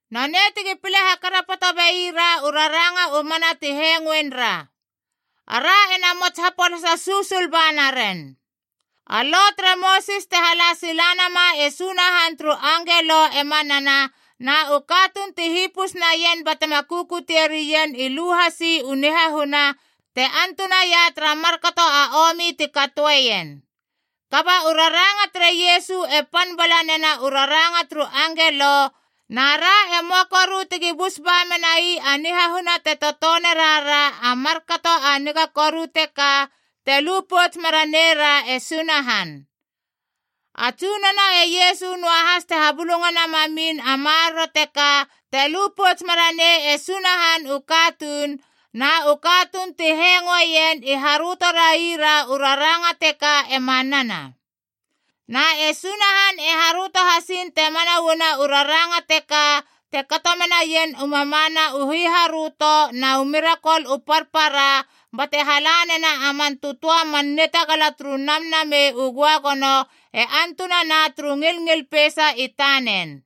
Nonei tegi pile hakarapoto beira u raranga u mana ti hengoen ra. Ara ena mots hapolasa susul ba naren. A Lo tere Mosis te hala sila nama e Sunahan turu angelo e manana, na u katuun ti hipus naien batema kukutie rien i lu hasi u nihahuna te antunaia tara markato a omi ti katoeien. Kaba u raranga tere Iesu e pan bala nena u raranga turu angelo, na ra e möa koru tegi bus ba menai a nihahuna te totone rara a markato a niga koru teka, te lu pouts mera neira e Sunahan. A Tsunono e Iesu noahas te habulungana mamin a maroro teka te lu pouts mera nei e Sunahan u katuun, na u katuun ti hengoeien i haröto raira u raranga teka e manana. Na e Sunahan e haröto hasiin te mana uana u raranga teka te kato menaien u mamana u hiharöto na u mirakol u parpara bate hala nena a man tötöa man nitagala turu Namnamei u Göagono e antunana turu ngilngil peisa i tanen.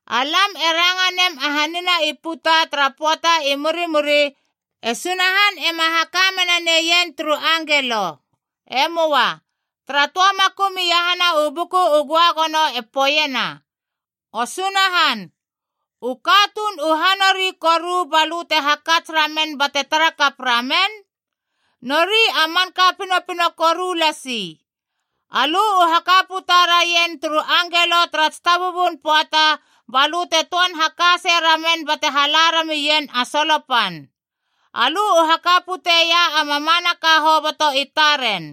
Alam e ranga nem a hanina i puta tara pöata i murimuri, e Sunahan ema haka mena neien turu angelo. E möa. Tara töa makum iahana u Buku u Göagono e poeiena: “O Sunahan, u katuun u ha nori koru ba lö te hakats ramen bate tara kap ramen? Nori a manka pinopino koru lasi. Alö u haka puta raien turu angelo tara tsitabubun pöata, ba lö te töan haka sei ramen bate hala ramien a solo pan. Alö u haka puteia a mamanaka hoboto i taren.”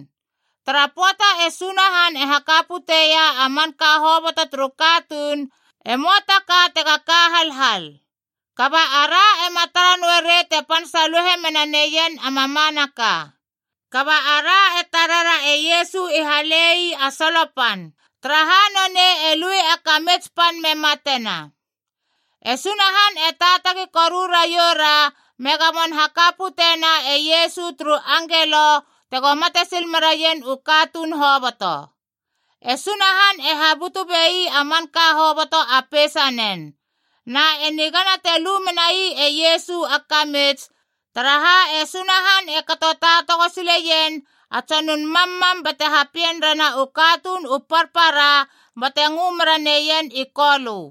Tara pöata e Sunahan e haka puteia a manka hoboto turu katuun, e möa ta ka tega ka halhal. Kaba ara ema tara noe rei te pan saluhe mena neien a mamanaka. Kaba ara e tarera e Iesu i hale ii a solo pan, taraha nonei e lui a kamits pan me matena. E Sunahan e taatagi koru raioura me gamon haka pute na e Iesu turu angelo tego mate sil meraien u katuun hoboto. E Sunahan e habutu bei a manka hoboto a peisanen. Na e nigana te lu menai e Iesu a kamits, taraha e Sunahan e kato taatago sileien a tsonun mammam bate hapien rena u katuun u parpara bate ngö mera neien i Kolö.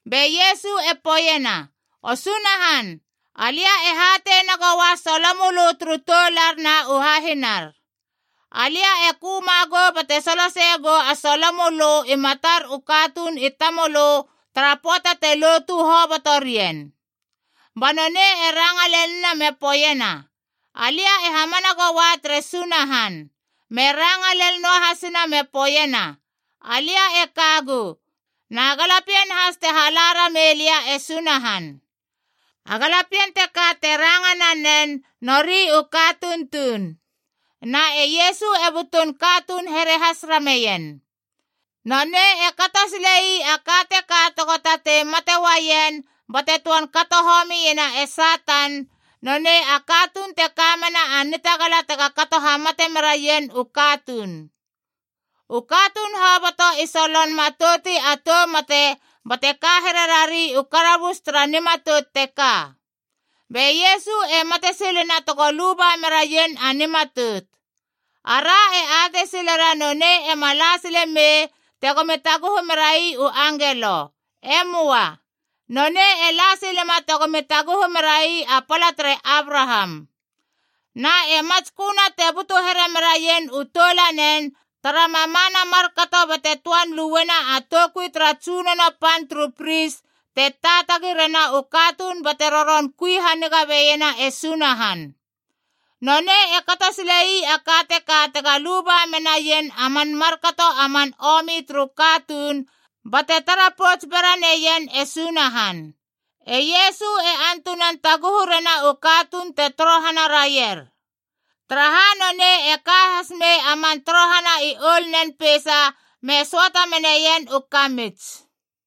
Be Iesu e poeiena, “O Sunahan, alia e hatei nagoua solo mölö turu toular na u hahinar. Alia e köma gou bate soloseie gou a solo mölö i matar u katuun i tamölö tara pöata te lotu hobotorien.” Ba nonei e ranga lenina me poeiena, “Alia e hamana goua tere Sunahan.” Me ranga lel noahasina me poeiena, “Alia e kagu, na galapien has te hala ramei lia e Sunahan.” A galapien teka te ranga nanen nori u katuun tuun, na e Iesu e butun katuun here has rameien. Nonei e kato sile ii a ka teka tego tatei mate uaien bate töan kato homiena e Satan, nonei a katuun te kamena a nitagala tega kato hamate meraien u katuun. U katuun hoboto i solon matouti a tou mate bate ka here rari u karabus tara nimatout teka. Be Iesu e mate silena tego luba meraien a nimatout. Ara e atei silera nonei ema la sile mei tegomi taguhu merai u angelo. E möa. Nonei e la silema tegomi taguhu merai a pala tere Abraham. Na e matsköna te butu here meraien u toulanen tara mamana markato bate töan luena a toukui tara tsunono pan turu pris te taatagi rena u katuun bate roron kui haniga beiena e Sunahan. Nonei e kato sile ii a ka teka tega luba menaien a man markato a man omi turu katuun bate tara pouts bera neien e Sunahan. E Iesu e antunan taguhu rena u katuun te torohana raier, taraha nonei e ka has mei a man torohana i oulnen peisa me söata meneien u kamits.